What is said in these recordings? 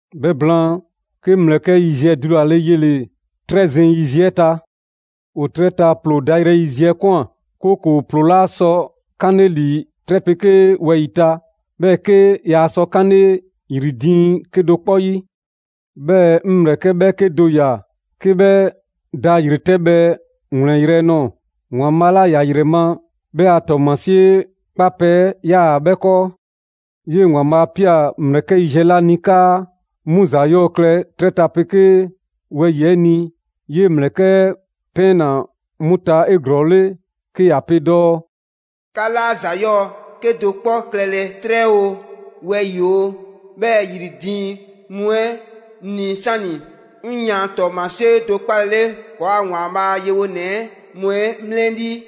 'Bhɛ blaan, 'ke 'ŋ ‑mlɛkɛ' yiziɛ dulale yele‑ 'trɛ zeŋ yiziɛ 'ɛ ta. ‑O 'trɛ ta ‑ploo dayrɛ yiziɛ 'ɛ ꞊kwan, 'kooko‑ ‑ploo 'laa sɔ 'kanle ‑li 'trɛ 'pegee wɛyi‑ ta, 'bhɛɛ‑ 'ke yaa sɔ 'kanle ‑yri diiŋ 'kedo‑ 'kpɔ 'yi. 'Bhɛɛ‑ 'ŋ ‑mlɛkɛ' 'bhɛɛke do ꞊ya 'ke 'bhɛ da ‑yretɛbhɛ ‑wlɛnyrɛ' nɔɔ‑. ‑Waanbhaa' 'la ‑ya ‑yrɛ ma 'bhɛ a ‑tɔɔmasie 'kpapɛ‑ ‑yaa 'bhɛ 'kɔɔ. 'Yee‑ ‑Waanbhaa' 'a ꞊pia ‑mlɛkɛ' yiziɛ 'la ni 'kaa 'mu ‑za 'yɔɔ‑ klɛ 'trɛ 'pegee wɛyi‑ 'ɛ ni, 'yee‑ ‑mlɛkɛ' 'ɛ ‑pɛɛnna 'mu ta 'eglɔɔle 'ke ‑ya pe dɔɔ: «'Ka 'laa ‑za 'yɔɔ‑ 'kedo‑ 'kpɔ klɛlɛ 'trɛ oo, wɛyi‑ oo, 'bhɛɛ‑ ‑yri diiŋ mu 'ɛ ni 'sani‑ 'ŋ yan ‑tɔɔmasie do 'kpalele ‑kɔɔa' ‑Waanbhaa' a yewonɛ mu 'ɛ 'mlɛlii.»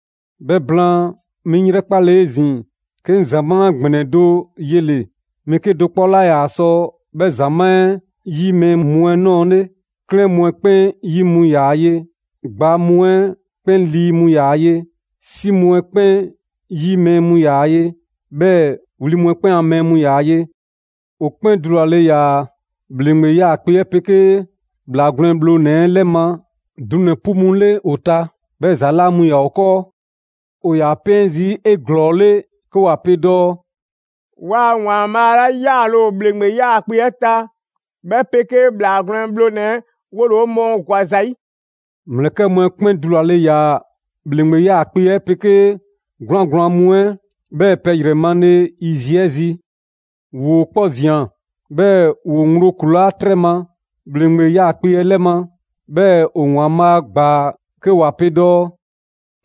'Bhɛ blaan, 'mi 'ŋ 'yrɛkpale 'ezin‑, 'ke 'ŋ ‑zamaa' ‑gbɛnɛ do yele‑: mɛɛ 'kedo‑ 'kpɔ 'laa ‑yaa sɔ 'bhɛ ‑zamaa' 'ɛ 'yi mɛɛ mu 'ɛ 'nɔɔle. 'Klɛɛn mu 'ɛ 'kpɛn 'yi mu ‑yaa ye; ‑gbaa mu 'ɛ 'kpɛn 'lii mu ‑yaa ye; 'si mu 'ɛ 'kpɛn 'yi mɛɛ mu ‑yaa ye, 'bhɛɛ‑ wli mu 'ɛ 'kpɛn a mɛɛ mu ‑yaa ye. ‑O 'kpɛn dulale ‑yaa ‑bhleŋgbe 'yaakpe‑ 'ɛ 'pegee ‑Bhlaa Gwlɛn Bhlonɛ‑ 'ɛ 'lɛ ma dunɛ‑ 'pu mu 'le ‑o ta, 'bhɛɛ‑ ‑za 'laa mu ‑yaa ‑o 'kɔɔ. ‑O ‑yaa 'pɛɛn zii' 'eglɔɔle 'ke ‑wa pe dɔɔ: «'Waa‑ ‑Waanbhaa' 'la 'yaale‑ ‑o ‑bhleŋgbe 'yaakpe‑ 'ɛ ta, 'bhɛ 'pegee ‑Bhlaa Gwlɛn Bhlonɛ‑ 'ɛ 'wole‑ 'o mɔɔ ‑gwa ‑za 'yi!» ‑Mlɛkɛ' mu 'ɛ 'kpɛn dulale ‑yaa ‑bhleŋgbe 'yaakpe‑ 'ɛ 'pegee 'gwlaan‑ gblaan mu 'ɛ, 'bhɛɛ‑ pɛ ‑yrɛ male yiziɛ 'ɛ zi. ‑Woo 'kpɔ ꞊zian 'bhɛɛ‑ ‑woo ŋgblo ‑kulaa' 'trɛ ma, ‑bhleŋgbe 'yaakpe‑ 'ɛ 'lɛ ma, 'bhɛɛ‑ ‑o ‑Waanbhaa' ‑gbaa. 'Ke ‑wa pe dɔɔ: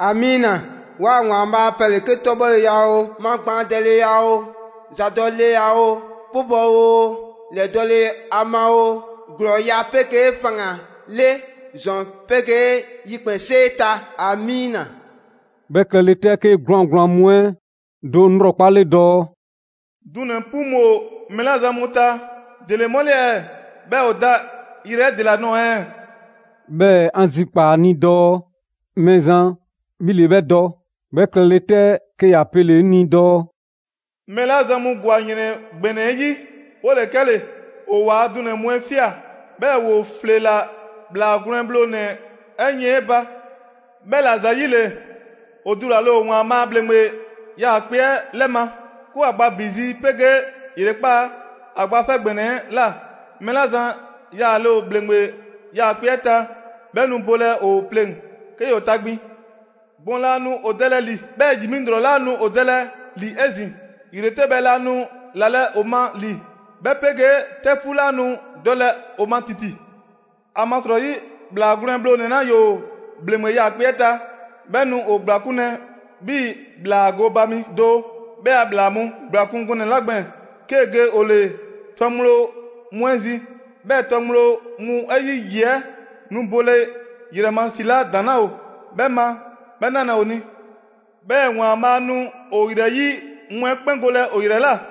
«‑Amiina! 'Waa‑ ‑Waanbhaa' ‑a pɛ ‑le 'ke 'tɔbhɔleya oo, magbaandɛleya oo, ‑zadɔleya oo, 'pubɔ‑ oo, lɛdɔle a ma oo, ‑glɔɔya' 'pegee faŋgan‑ 'le ‑zɔn 'pegee ‑yikpɛnsee ta! ‑Amiina.» 'Bhɛ klɛle 'tɛ, 'ke 'gwlaan‑ gblaan mu 'ɛ do 'ŋ 'lrɔkpale dɔɔ: «Dunɛ‑ 'pu mu ‑o mɛɛ 'la zan mu ta, ‑dele 'mu 'le ɛɛ? 'Bhɛɛ‑ ‑o ‑daa yrɛ 'ɛ ‑dela nɔɔ‑ ɛɛ?» 'Bhɛɛ‑ 'an zikpaa‑ ‑a ni dɔɔ: «Mɛɛzan, 'bhi ‑le 'bhɛ dɔ.» 'Bhɛ klɛle 'tɛ, 'ke ‑ya pele‑ 'ŋ ni dɔɔ: «Mɛɛ 'la zan mu ‑gwa ‑yrɛn ‑gbɛnɛ 'ɛ 'yi, 'wole‑ 'kɛle‑. ‑O ‑waa dunɛ‑ mu 'ɛ ꞊fia, 'bhɛɛ‑ ‑woo ‑fleela ‑Bhlaa Gwlɛn Bhlonɛ‑ 'ɛ yiɛn 'ɛ ba. 'Bhɛla‑ ‑zayile, ‑o dulale ‑o ‑Waanbhaa' a ‑bhleŋgbe 'yaakpe‑ 'ɛ 'lɛ ma, 'ke ‑wa gba ‑bi zi 'pegee ‑yrekpaa' ‑a Gba 'Fɛ ‑Gbɛnɛ 'ɛ ꞊la. Mɛɛ 'la zan yaale ‑o ‑bhleŋgbe 'yaakpe‑ 'ɛ ta, 'bhɛ nu bolɛ ‑o pleŋ‑, 'ke ‑yoo tagbin. Gbɔn laa nu ‑o dɛlɛ ‑li, 'bhɛɛ‑ ‑yi mi ‑lrɔ 'laa nu ‑o dɛlɛ ‑li 'ezin‑; ‑yretɛbhɛ 'laa nu ‑lalɛ' ‑o ma ‑li, 'bhɛ 'pegee 'tɛfuu 'laa nu dɔlɛ ‑o ma ‑titi. ‑Amasrɔyi, ‑Bhlaa Gwlɛn Bhlonɛ‑ 'la ‑yoo ‑bhleŋgbe 'yaakpe‑ 'ɛ ta, 'bhɛ nu ‑o ‑gblakunlɛ 'bhii‑ ‑bhlaa gooba mi do 'bhɛ a ‑bhlaa mu ‑gblakun' gɔnɛ‑ 'la gbɛɛn‑, 'kee‑ ge ‑o ‑le tɔ ŋgblo mu 'ɛ zi. 'Bhɛ tɔ ŋgblo mu 'ɛ 'yi ‑yi 'ɛ nu bole ‑yrɛ ma ‑si 'la ‑daŋ' 'laa ‑o 'bhɛ ma 'bhɛ 'nalɛ‑ ‑o ni. 'Bhɛɛ‑ ‑Waanbhaa' nu ‑o ‑yrɛyi' mu 'ɛ 'kpɛn golɛ ‑o ‑yrɛ ꞊la.»